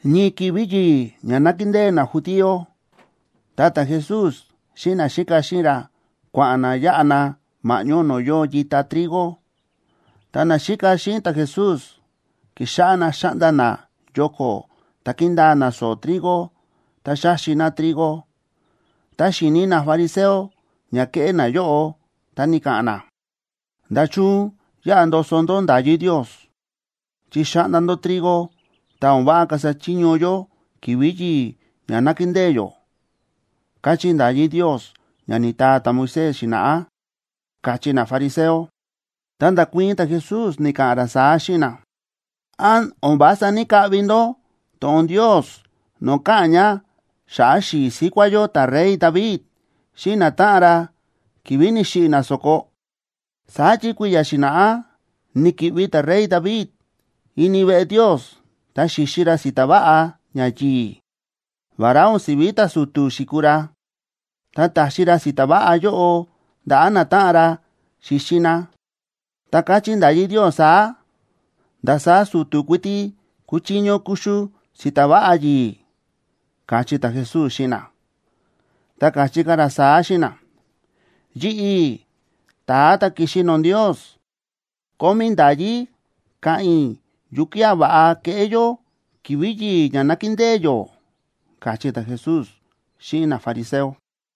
Ñii ki̱vi̱ yi̱i̱ ña nákindée najudío, ta ta̱Jesús xíꞌin naxíka xíꞌin ra, kua̱ꞌa̱n na yáꞌa na ma̱ꞌñó no̱o̱ yóo yita trigo. Ta naxíka xíꞌin ta̱Jesús ki̱xáꞌá na xa̱ꞌnda na yoko̱ ta ki̱ndaa na so̱o̱ trigo, ta xa̱xi na trigo. Ta xi̱ni nafariseo ña ke̱ꞌé nayóꞌo, ta ni̱ka̱ꞌa̱n na: ―¿Nda̱chun yáꞌa ndoso ndó nda̱yí Ndios?, chi xa̱ꞌnda ndó trigo, ta o̱n váꞌa kasa chiño yó ki̱vi̱ yi̱i̱ ña nákindée yó, káchí nda̱yí Ndios ña ni̱taa ta̱Moisés xi̱na̱ꞌá ―káchí nafariseo. Ta nda̱kuii̱n ta̱Jesús, ni̱ka̱ꞌa̱n ra saá xíꞌin na: ―¿Án o̱n vása ní‑kaꞌvi ndó to̱ꞌon Ndios no̱o̱ káꞌa̱n ña xa̱ꞌa̱ xi̱i̱ síkuá yó ta̱rey David xíꞌin natáꞌan ra ki̱vi̱ ni̱xiꞌi̱ na so̱ko? Saá chi kui̱ya̱ xi̱na̱ꞌá ni̱ki̱ꞌvi ta̱rey David ini veꞌe Ndios, ta xi̱xi ra si̱ta̱ váꞌa ñayi̱i̱, vará o̱n si̱ví ta̱su̱tu̱ xi̱kuu ra. Ta ta̱xi ra si̱ta̱ váꞌa yóꞌo ndaꞌa̱ natáꞌan ra xíxi na. Ta káchí nda̱yí Ndios saá: “Ndasaá su̱tu̱ kuiti kúchiño kuxu si̱ta̱ váꞌa yi̱i̱” ―káchí ta̱Jesús xíꞌin na. Ta káchí ka̱ ra saá xíꞌin na: ―Yi̱ꞌi̱, ta̱a ta̱ ki̱xi no̱o̱ Ndios, kómí i̱ nda̱yí ka̱ꞌa̱n i̱ yukía̱ va̱ꞌa keꞌé yó ki̱vi̱ yi̱i̱ ña nákindée yó ―káchí ta̱Jesús xíꞌin nafariseo.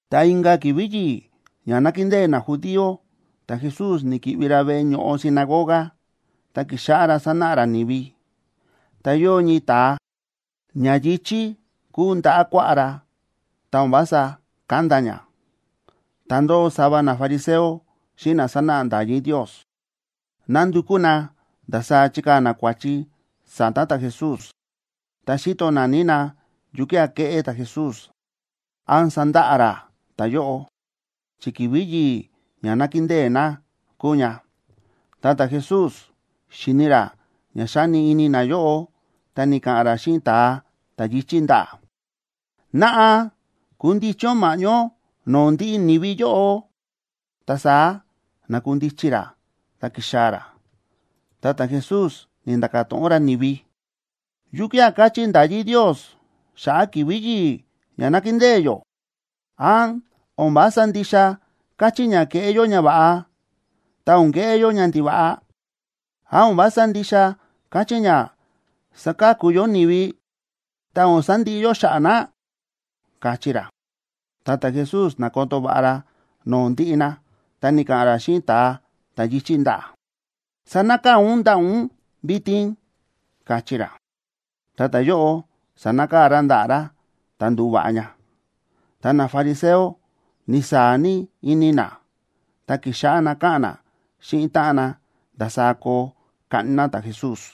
Ta inka̱ ki̱vi̱ yi̱i̱ ña nákindée najudío, ta̱Jesús ni̱ki̱ꞌvi ra veꞌe ño̱ꞌo sinagoga, ta ki̱xáꞌá ra sánáꞌa ra ni̱vi. Ta yóo ñii ta̱a, ña yi̱chí kúu ndaꞌa̱ kuaꞌá ra, ta o̱n vása kánda ña. Ta ndóo sava nafariseo xíꞌin na sánáꞌa nda̱yí Ndios, nándukú na ndasaá chikaa̱ na kua̱chi sa̱ta̱ ta̱Jesús. Ta xíto naní na yukía̱ keꞌé ta̱Jesús, án sandaꞌa ra ta̱yóꞌo, chi ki̱vi̱ yi̱i̱ ña nákindée na kúu ña. Ta ta̱Jesús xíni̱ ra ña xáni ini nayóꞌo, ta ni̱ka̱ꞌa̱n ra xíꞌin ta̱a ta̱ yi̱chí ndaꞌa̱: ―Naꞌa kundichi ún ma̱ꞌñó no̱o̱ ndiꞌi ni̱vi yóꞌo. Ta saá na̱kundichi ra ta ki̱xaa̱ ra. Ta ta̱Jesús ni̱nda̱ka̱ to̱ꞌon ra ni̱vi: ―¿Yukía̱ káchí nda̱yí Ndios xa̱ꞌa̱ ki̱vi̱ yi̱i̱ ña nákindée yó? ¿Án o̱n vása ndixa káchí ña keꞌé yó ñava̱ꞌa, ta o̱n keꞌé yó ñandiva̱ꞌa? ¿Án o̱n vása ndixa káchí ña saka̱ku yó ni̱vi, ta o̱n sandiꞌi yó xa̱ꞌa̱ na? ―káchí ra. Ta ta̱Jesús na̱koto va̱ꞌa ra no̱o̱ ndiꞌi na, ta ni̱ka̱ꞌa̱n ra xíꞌin ta̱a ta̱ yi̱chí ndaꞌa̱: ―Sanakaa̱ ún ndaꞌa̱ ún vitin ―káchí ra. Ta ta̱yóꞌo sa̱nakaa̱ ra ndaꞌa̱ ra, ta ndu̱va̱ꞌa ña. Ta nafariseo ni̱saa̱ ní ini na, ta ki̱xáꞌá na káꞌa̱n na xíꞌin táꞌan na ndasaá koo kaꞌni na ta̱Jesús.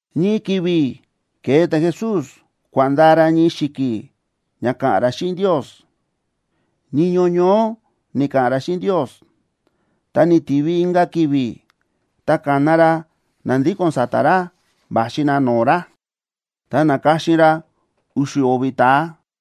Ñii ki̱vi̱ ke̱e ta̱Jesús kua̱ꞌa̱n ndaa ra ñii xi̱ki̱ ña ka̱ꞌa̱n ra xíꞌin Ndios. Niño ñoó ni̱ka̱ꞌa̱n ra xíꞌin Ndios. Ta ni̱tivi inka̱ ki̱vi̱. Ta ka̱na ra na ndíko̱n sa̱ta̱ ra va̱xi na no̱o̱ ra, ta na̱ka̱xin ra u̱xu̱ o̱vi̱ ta̱a,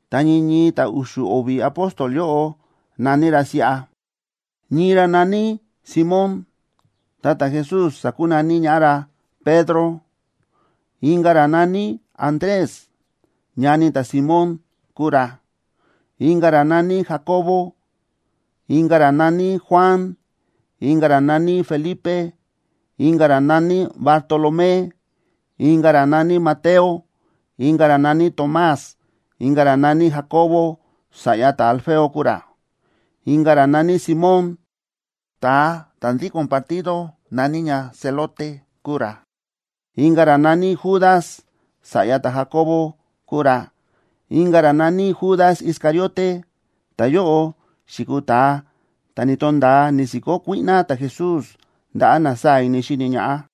Ta ñii ñii ta̱ u̱xu̱ o̱vi̱ apóstol yóꞌo na̱ní ra siꞌa: ñii ra na̱ní Simón, ta ta̱Jesús sa̱kunaní ñaꞌá ra Pedro; inka̱ ra na̱ní Andrés, ñani ta̱Simón kúu ra; inka̱ ra na̱ní Jacobo; inka̱ ra na̱ní Juan; inka̱ ra na̱ní Felipe; inka̱ ra na̱ní Bartolomé; inka̱ ra na̱ní Mateo; inka̱ ra na̱ní Tomás; inka̱ ra na̱ní Jacobo, sa̱ꞌya ta̱Alfeo kúu ra; inka̱ ra na̱ní Simón, ta̱a ta̱ ndíko̱n partido na̱ní ña zelote kúu ra; inka̱ ra na̱ní Judas, sa̱ꞌya ta̱Jacobo kúu ra; inka̱ ra na̱ní Judas Iscariote, ta̱yóꞌo xi̱kuu ta̱a ta̱ ni̱to̱nda̱a ni̱si̱kó kuíꞌná ta̱Jesús ndaꞌa̱ na sáa̱ ini xíni ñaꞌá.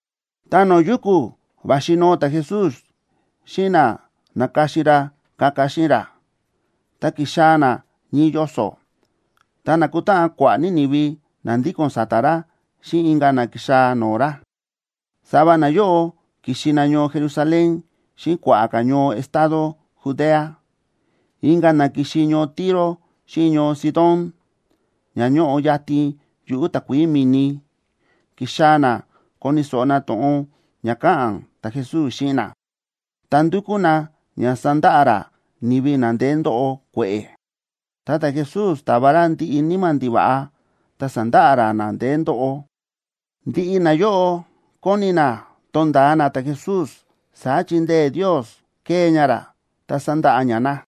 Ta no̱o̱ yuku̱ va̱xi noo ta̱Jesús xíꞌin na na̱ka̱xin ra kaka xíꞌin ra, ta ki̱xaa̱ na ñii yoso̱. Ta na̱kutáꞌan kua̱ꞌa̱ ní ni̱vi na ndíko̱n sa̱ta̱ ra xíꞌin inka̱ na ki̱xaa̱ no̱o̱ ra. Sava nayóꞌo ki̱xi na ñoo Jerusalén xíꞌin kua̱ꞌa̱ ka̱ ñoo estado Judea, inka̱ na ki̱xi ñoo Tiro xíꞌin ñoo Sidón, ña ñóꞌo yatin yuꞌu̱ takuií mi̱ni. Ki̱xaa̱ na koni̱ so̱ꞌo na to̱ꞌon ña ka̱ꞌa̱n ta̱Jesús xíꞌin na, ta ndúkú na ña sandaꞌa ra ni̱vi na ndeé ndóꞌo kue̱ꞌe̱. Ta ta̱Jesús ta̱va ra ndiꞌi níma̱ ndiva̱ꞌa, ta sa̱ndaꞌa ra na ndeé ndóꞌo. Ndiꞌi nayóꞌo kóni na tonda̱a na ta̱Jesús, saá chi ndee̱ Ndios kée ña ra, ta sándaꞌa ña na.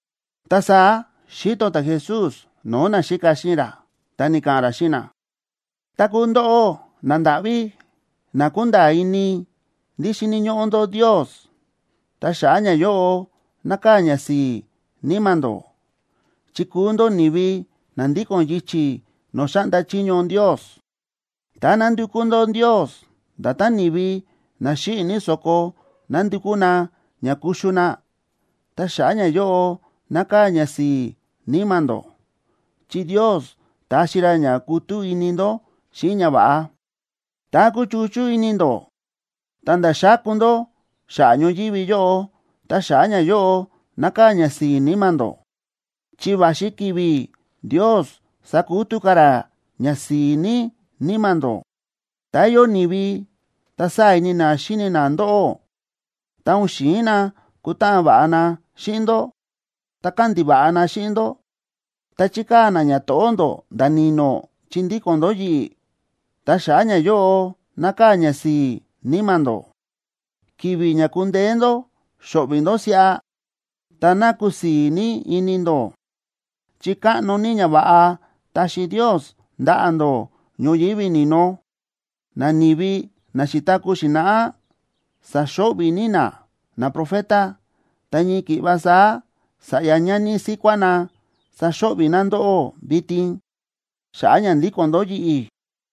Ta saá xíto ta̱Jesús no̱o̱ naxíka xíꞌin ra, ta ni̱ka̱ꞌa̱n ra xíꞌin na: ―Tá kúu ndóꞌó nandáꞌví, na kúnda̱a̱ ini ndí xíni̱ ñóꞌó ndó Ndios, ta xa̱ꞌa̱ ñayóꞌo nákaa̱ ñasi̱i̱ níma̱ ndó, chi kúu ndó ni̱vi na ndíko̱n yichi̱ no̱o̱ xáꞌnda chiño Ndios. ’Tá nándukú ndó Ndios, nda̱tán ni̱vi na xíꞌi̱ ní so̱ko nándukú na ña kuxu na, ta xa̱ꞌa̱ ñayóꞌo nákaa̱ ñasi̱i̱ níma̱ ndó, chi Ndios taxi ra ña kutú ini ndó xíꞌin ñava̱ꞌa. ’Tá kúchuchú ini ndó ta̱nda̱ xáku ndó xa̱ꞌa̱ ñoyívi yóꞌo, ta xa̱ꞌa̱ ñayóꞌo nákaa̱ ñasi̱i̱ níma̱ ndó, chi va̱xi ki̱vi̱ Ndios sakutú ka̱ ra ñasi̱i̱ ní níma̱ ndó. ’Tá yóo ni̱vi ta sáa̱ ini na xíni na ndóꞌó, ta o̱n xi̱in na kutáꞌan va̱ꞌa na xíꞌin ndó, ta kándiva̱ꞌa na xíꞌin ndó ta chíkaa̱ na ñato̱ꞌó ndó nda̱ ni̱no̱ chi ndíko̱n ndó yi̱ꞌi̱, ta xa̱ꞌa̱ ñayóꞌo nákaa̱ ñasi̱i̱ níma̱ ndó. Ki̱vi̱ ña ku̱ndeé ndó xóꞌvi̱ ndó siꞌa, ta ná kusii̱ ní ini ndó, chi káꞌno ní ñava̱ꞌa taxi Ndios ndaꞌa̱ ndó ñoyívi ni̱no. Nani̱vi na xi̱taku̱ xi̱na̱ꞌá sa̱xo̱ꞌvi̱ ní na naprofeta, ta ñii ki̱ꞌva saá sa̱ꞌya ñani síkuá na saxo̱ꞌvi̱ na ndóꞌó vitin, xa̱ꞌa̱ ña ndíko̱n ndó yi̱ꞌi̱.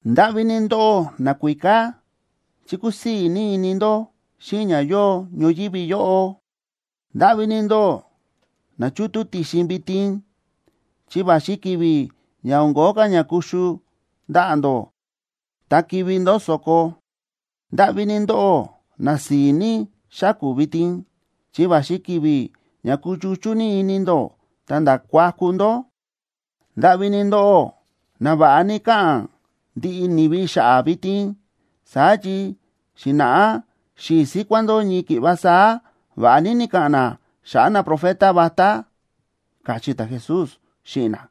’¡Ndáꞌví ní ndóꞌó nakuíká!, chi kúsii̱ ní ini ndó xíꞌin ña yóo ñoyívi yóꞌo. ’¡Ndáꞌví ní ndóꞌó na chútú ti̱xin vitin!, chi va̱xi ki̱vi̱ ña o̱n kóo ka̱ ña kuxu ndaꞌa̱ ndó, ta kivi̱ ndó so̱ko. ’¡Ndáꞌví ní ndóꞌó na si̱i̱ ní xáku̱ vitin!, chi va̱xi ki̱vi̱ ña kuchuchú ní ini ndó ta̱nda̱ kuaku ndó. ’¡Ndáꞌví ní ndóꞌó na va̱ꞌa ní káꞌa̱n ndiꞌi ni̱vi xa̱ꞌa̱ vitin! Saá chi xi̱na̱ꞌá xi̱i̱ síkuá ndó ñii ki̱ꞌva saá va̱ꞌa ní ni̱ka̱ꞌa̱n na xa̱ꞌa̱ naprofeta vatá ―káchí ta̱Jesús xíꞌin na.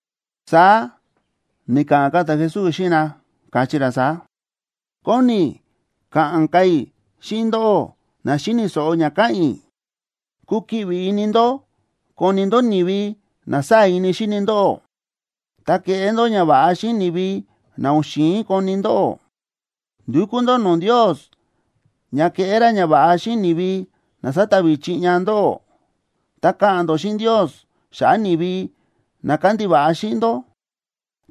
Saá ni̱ka̱ꞌa̱n ka̱ ta̱Jesús xíꞌin na, káchí ra saá: ―Kóni i̱ ka̱ꞌa̱n ka̱ i̱ xíꞌin ndóꞌó na xíni̱ so̱ꞌo ña káꞌa̱n i̱: Kukiꞌvi ini ndó koni ndó ni̱vi na sáa̱ ini xíni ndóꞌó, ta keꞌé ndó ñava̱ꞌa xíꞌin ni̱vi na o̱n xi̱in koni ndóꞌó. Ndukú ndó no̱o̱ Ndios ña keꞌé ra ñava̱ꞌa xíꞌin ni̱vi na sátavi chiꞌña ndóꞌó, ta ka̱ꞌa̱n ndó xíꞌin Ndios xa̱ꞌa̱ ni̱vi na kándiva̱ꞌa xíꞌin ndó.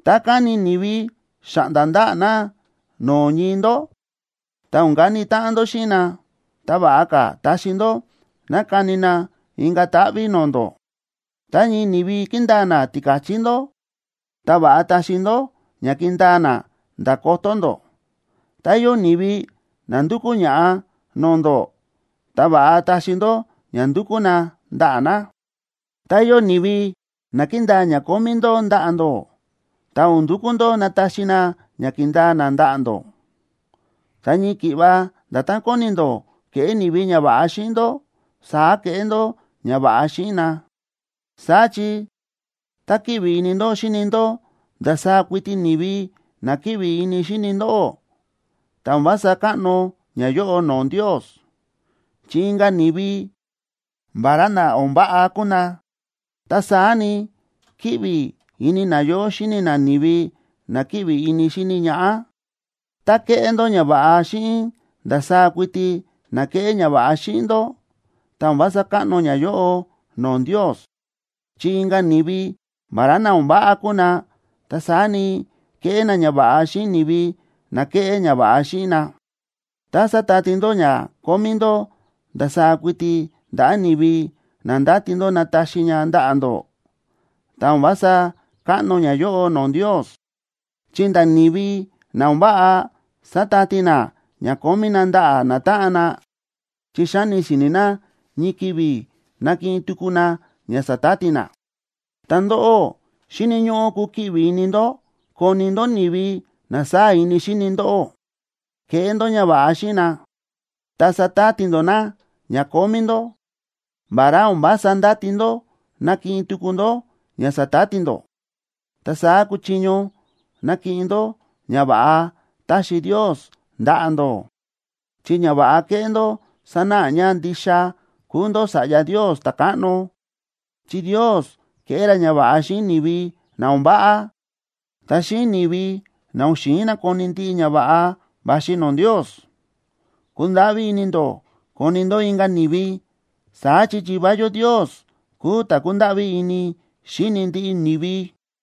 Tá káni ni̱vi xáꞌnda ndaꞌa̱ na no̱o̱ ñii ndó, ta o̱n kani táꞌan ndó xíꞌin na, ta va̱ꞌa ka̱ taxi ndó ná kani na inka̱ táꞌví no̱o̱ ndó. Tá ñii ni̱vi kíndaa na tika̱chí ndó, ta va̱ꞌa taxi ndó ña kindaa na nda̱ kotó ndó. Tá yóo ni̱vi na ndúkú ña̱ꞌa no̱o̱ ndó, ta va̱ꞌa taxi ndó ña ndúkú na ndaꞌa̱ na. Tá yóo ni̱vi na kíndaa ña kómí ndó ndaꞌa̱ ndó, ta o̱n ndukú ndó nataxi na ña ki̱ndaa na ndaꞌa̱ ndó. Ta ñii ki̱ꞌva nda̱tán kóni ndó keꞌé ni̱vi ñava̱ꞌa xíꞌin ndó, saá keꞌé ndó ñava̱ꞌa xíꞌin na. ’Saá chi tá kíꞌvi ini ndó xíni ndó ndasaá kuiti ni̱vi na kíꞌvi ini xíni ndóꞌó, ta o̱n vása káꞌno ñayóꞌo no̱o̱ Ndios, chi inka̱ ni̱vi, vará na o̱n váꞌa kúu na, ta saá ni, kíꞌvi ini nayóꞌo xíni na ni̱vi na kíꞌvi ini xíni ñaꞌá. Tá kéꞌé ndó ñava̱ꞌa xíꞌin ndasaá kuiti na kéꞌé ñava̱ꞌa xíꞌin ndó, ta o̱n vása káꞌno ñayóꞌo no̱o̱ Ndios, chi inka̱ ni̱vi, vará na o̱n váꞌa kúu na, ta saá ni, kéꞌé na ñava̱ꞌa xíꞌin ni̱vi na kéꞌé ñava̱ꞌa xíꞌin na. Tá sátati ndó ña kómí ndó ndasaá kuiti ndaꞌa̱ ni̱vi na ndáti ndó nataxi ña ndaꞌa̱ ndó, ta o̱n vása káꞌno ñayóꞌo no̱o̱ Ndios, chi nda̱ ni̱vi na o̱n váꞌa sátati na ña kómí na ndaꞌa̱ natáꞌan na, chi xáni si̱ni̱ na ñii ki̱vi̱ nakiꞌin tuku na ña sa̱tati na. Ta ndóꞌó, xíni̱ ñóꞌó kukiꞌvi ini ndó koni ndó ni̱vi na sáa̱ ini xíni ndóꞌó. Keꞌé ndó ñava̱ꞌa xíꞌin na, ta satati ndó na ña kómí ndó, vará o̱n vása ndáti ndó nakiꞌin tuku ndó ña sa̱tati ndó. Ta saá kuchiño nakiꞌin ndó ñava̱ꞌa taxi Ndios ndaꞌa̱ ndó. Chi ñava̱ꞌa keꞌé ndó sanáꞌa ña ndixa kúu ndó sa̱ꞌya Ndios ta̱káꞌno. Chi Ndios kéꞌé ra ñava̱ꞌa xíꞌin ni̱vi na o̱n váꞌa, ta xíꞌin ni̱vi na o̱n xi̱in nakoni ndiꞌi ñava̱ꞌa va̱xi no̱o̱ Ndios. Kundáꞌví ini ndó koni ndó inka̱ ni̱vi, saá chi Yivá yó Ndios kúu ta̱ kúndáꞌví ní ini xíni ndiꞌi ni̱vi.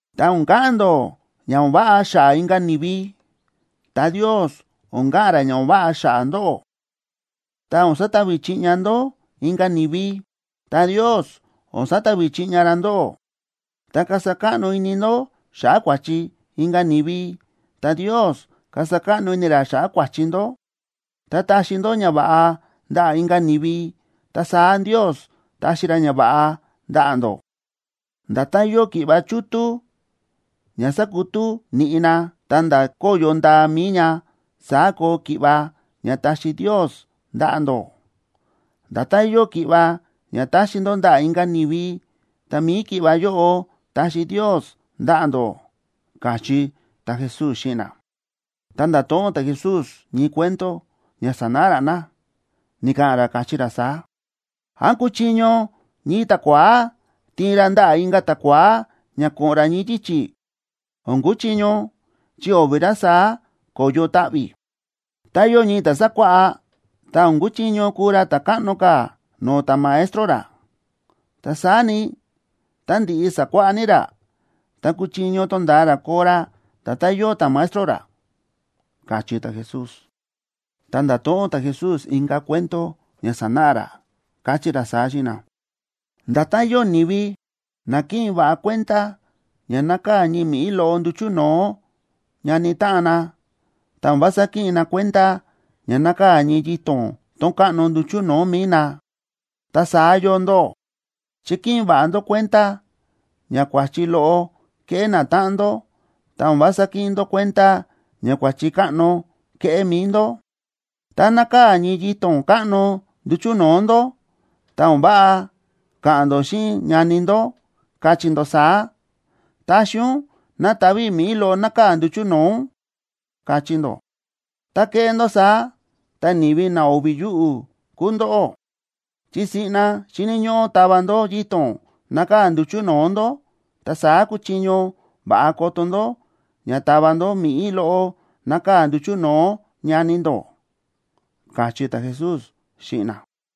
’Tá o̱n ka̱ꞌa̱n ndó ña o̱n váꞌa xa̱ꞌa̱ inka̱ ni̱vi, ta Ndios o̱n ka̱ꞌa̱n ra ña o̱n váꞌa xa̱ꞌa̱ ndóꞌó. Tá o̱n satavi chiꞌña ndó inka̱ ni̱vi, ta Ndios o̱n satavi chiꞌña ra ndóꞌó. Tá kasa káꞌno ini ndó xa̱ꞌa̱ kua̱chi inka̱ ni̱vi, ta Ndios kasa káꞌno ini ra xa̱ꞌa̱ kua̱chi ndó. Tá taxi ndó ñava̱ꞌa ndaꞌa̱ inka̱ ni̱vi, ta saá Ndios taxi ra ñava̱ꞌa ndaꞌa̱ ndó. Nda̱tán yóo ki̱ꞌva chútú ña sákutú niꞌi na, ta̱nda̱ kóyo ndaa mi̱i ña, saá koo ki̱ꞌva ña taxi Ndios ndaꞌa̱ ndó. Nda̱tán yóo ki̱ꞌva ña taxi ndó ndaꞌa̱ inka̱ ni̱vi, ta mi̱i ki̱ꞌva yóꞌo taxi Ndios ndaꞌa̱ ndó ―káchí ta̱Jesús xíꞌin na. Ta nda̱to̱ꞌon ta̱Jesús ñii cuento ña sanáꞌa ra na. Ni̱ka̱ꞌa̱n ra, káchí ra saá: ―¿Án kúchiño ñii ta̱kua̱á tiin ra ndaꞌa̱ inka̱ ta̱kua̱á ña ko̱ꞌo̱n ra ñii yichi̱? O̱n kuchiño, chi o̱vi̱ ra saá ko̱yo taꞌvi̱. Tá yóo ñii ta̱ sákuáꞌá, ta o̱n kuchiño kuu ra ta̱ káꞌno ka̱ no̱o̱ ta̱maestro ra. Ta saá ni, tá ndi̱ꞌi sa̱kuáꞌá ní ra, ta kuchiño tonda̱a ra koo ra nda̱tán yóo ta̱maestro ra ―káchí ta̱Jesús. Ta nda̱to̱ꞌon ta̱Jesús inka̱ cuento ña sanáꞌa ra, káchí ra saá xíꞌin na: ―Nda̱tán yóo ni̱vi na kíꞌin va̱ꞌa kuenda ña nákaa̱ ñii mi̱ꞌí loꞌo nduchu̱ no̱o̱ ñani táꞌan na, ta o̱n vása kíꞌin na kuenda ña nákaa̱ ñii yito̱n tón káꞌno nduchu̱ no̱o̱ mi̱i na, ta saá yóo ndóꞌó, chi kíꞌin va̱ꞌa ndó kuenda ña kua̱chi loꞌo kéꞌé natáꞌan ndó, ta o̱n vása kíꞌin ndó kuenda ña kua̱chi káꞌno kéꞌé mi̱i ndó. Tá nákaa̱ ñii yito̱n káꞌno nduchu̱ no̱o̱ ndó, ta o̱n váꞌa ka̱ꞌa̱n ndó xíꞌin ñani ndó, kachí ndó saá: “Taxi ún ná tava i̱ mi̱ꞌí loꞌo nákaa̱ nduchu̱ no̱o̱ ún”, kachí ndó. Tá kéꞌé ndó saá, ta, ¡ni̱vi na o̱vi̱ yuꞌu̱ kúu ndóꞌó! Chi siꞌna xíni̱ ñóꞌó tava ndó yito̱n nákaa̱ nduchu̱ no̱o̱ ndó, ta saá kuchiño va̱ꞌa koto ndó ña tava ndó mi̱ꞌí loꞌo nákaa̱ nduchu̱ no̱o̱ ñani ndó ―káchí ta̱Jesús xíꞌin na.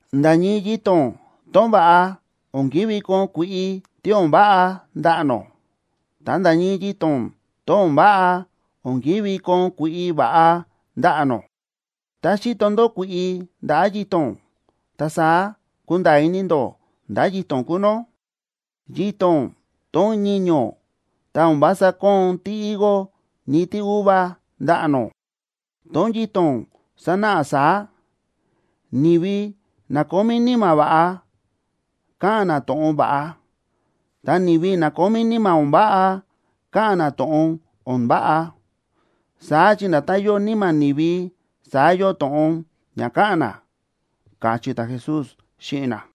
―Nda̱ ñii yito̱n tón va̱ꞌa, o̱n ki̱ví koon kui̱ꞌi tí o̱n váꞌa ndaꞌa̱ nó, ta nda̱ ñii yito̱n tón o̱n váꞌa, o̱n ki̱ví koon kui̱ꞌi va̱ꞌa ndaꞌa̱ nó. Tá xíto ndó kui̱ꞌi ndaꞌa̱ yito̱n, ta saá kúnda̱a̱ ini ndó ndá yito̱n kúu nó. Yito̱n tón ñiño̱ ta o̱n vása kóon tíhigo ni tíuva ndaꞌa̱ nó. Tón yito̱n sánáꞌa saá: Ni̱vi na kómí níma̱ va̱ꞌa, káꞌa̱n na to̱ꞌon va̱ꞌa. Ta ni̱vi na kómí níma̱ o̱n váꞌa, káꞌa̱n na to̱ꞌon o̱n váꞌa. Saá chi nda̱tán yóo níma̱ ni̱vi, saá yóo to̱ꞌon ña káꞌa̱n na ―káchí ta̱Jesús xíꞌin na.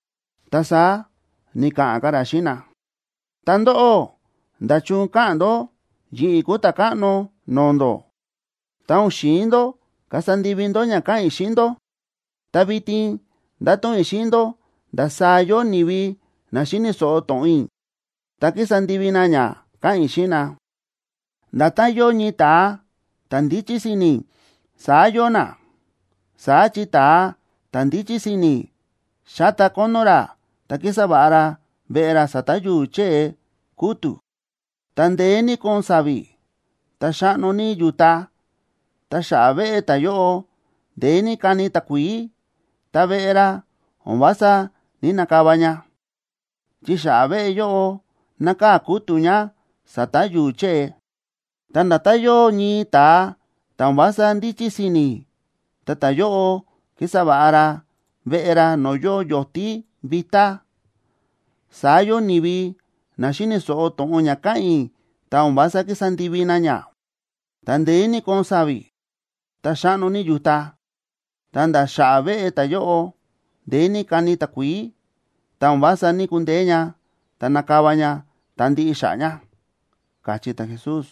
Ta saá ni̱ka̱ꞌa̱n ka̱ ra xíꞌin na: ―Ta ndóꞌó, ¿nda̱chun káꞌa̱n ndó yi̱ꞌi̱ kúu Ta̱káꞌno no̱o̱ ndó, ta o̱n xi̱in ndó kasa ndivi ndó ña káꞌa̱n i̱ xíꞌin ndó? Ta vitin ndáto̱ꞌon i̱ xíꞌin ndó ndasaá yóo ni̱vi na xíni̱ so̱ꞌo to̱ꞌon i̱ ta kísa ndivi na ña káꞌa̱n i̱ xíꞌin na. Nda̱tán yóo ñii ta̱a ta̱ ndíchí si̱ni̱, saá yóo na. Saá chi ta̱a ta̱ ndíchí si̱ni̱ xáta kónó ra ta kísa va̱ꞌa ra veꞌe ra sa̱ta̱ yu̱u̱ chée kútu̱. Tá ndeé ní kóon sa̱vi̱, ta xáꞌno ní yu̱ta, ta xa̱ꞌa̱ veꞌe ta̱yóꞌo ndeé ní káni takuií, ta veꞌe ra o̱n vása ní‑nakava ña, chi xa̱ꞌa̱ veꞌe yóꞌo nákaa̱ kútu̱ ña sa̱ta̱ yu̱u̱ chée. Ta nda̱tán yóo ñii ta̱a ta̱ o̱n vása ndíchí si̱ni̱, ta ta̱yóꞌo kísa va̱ꞌa ra veꞌe ra no̱o̱ yóo yo̱tí vitá, saá yóo ni̱vi na xíni̱ so̱ꞌo to̱ꞌon ña káꞌa̱n i̱, ta o̱n vása kísa ndivi na ña. Tá ndeé ní kóon sa̱vi̱, ta xáꞌno ní yu̱ta, ta̱nda̱ xa̱ꞌa̱ veꞌe ta̱yóꞌo ndeé ní káni takuií, ta o̱n vása ní‑kundeé ña, ta na̱kava ña ta ndi̱ꞌi xa̱ꞌa̱ ña ―káchí ta̱Jesús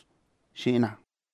xíꞌin na.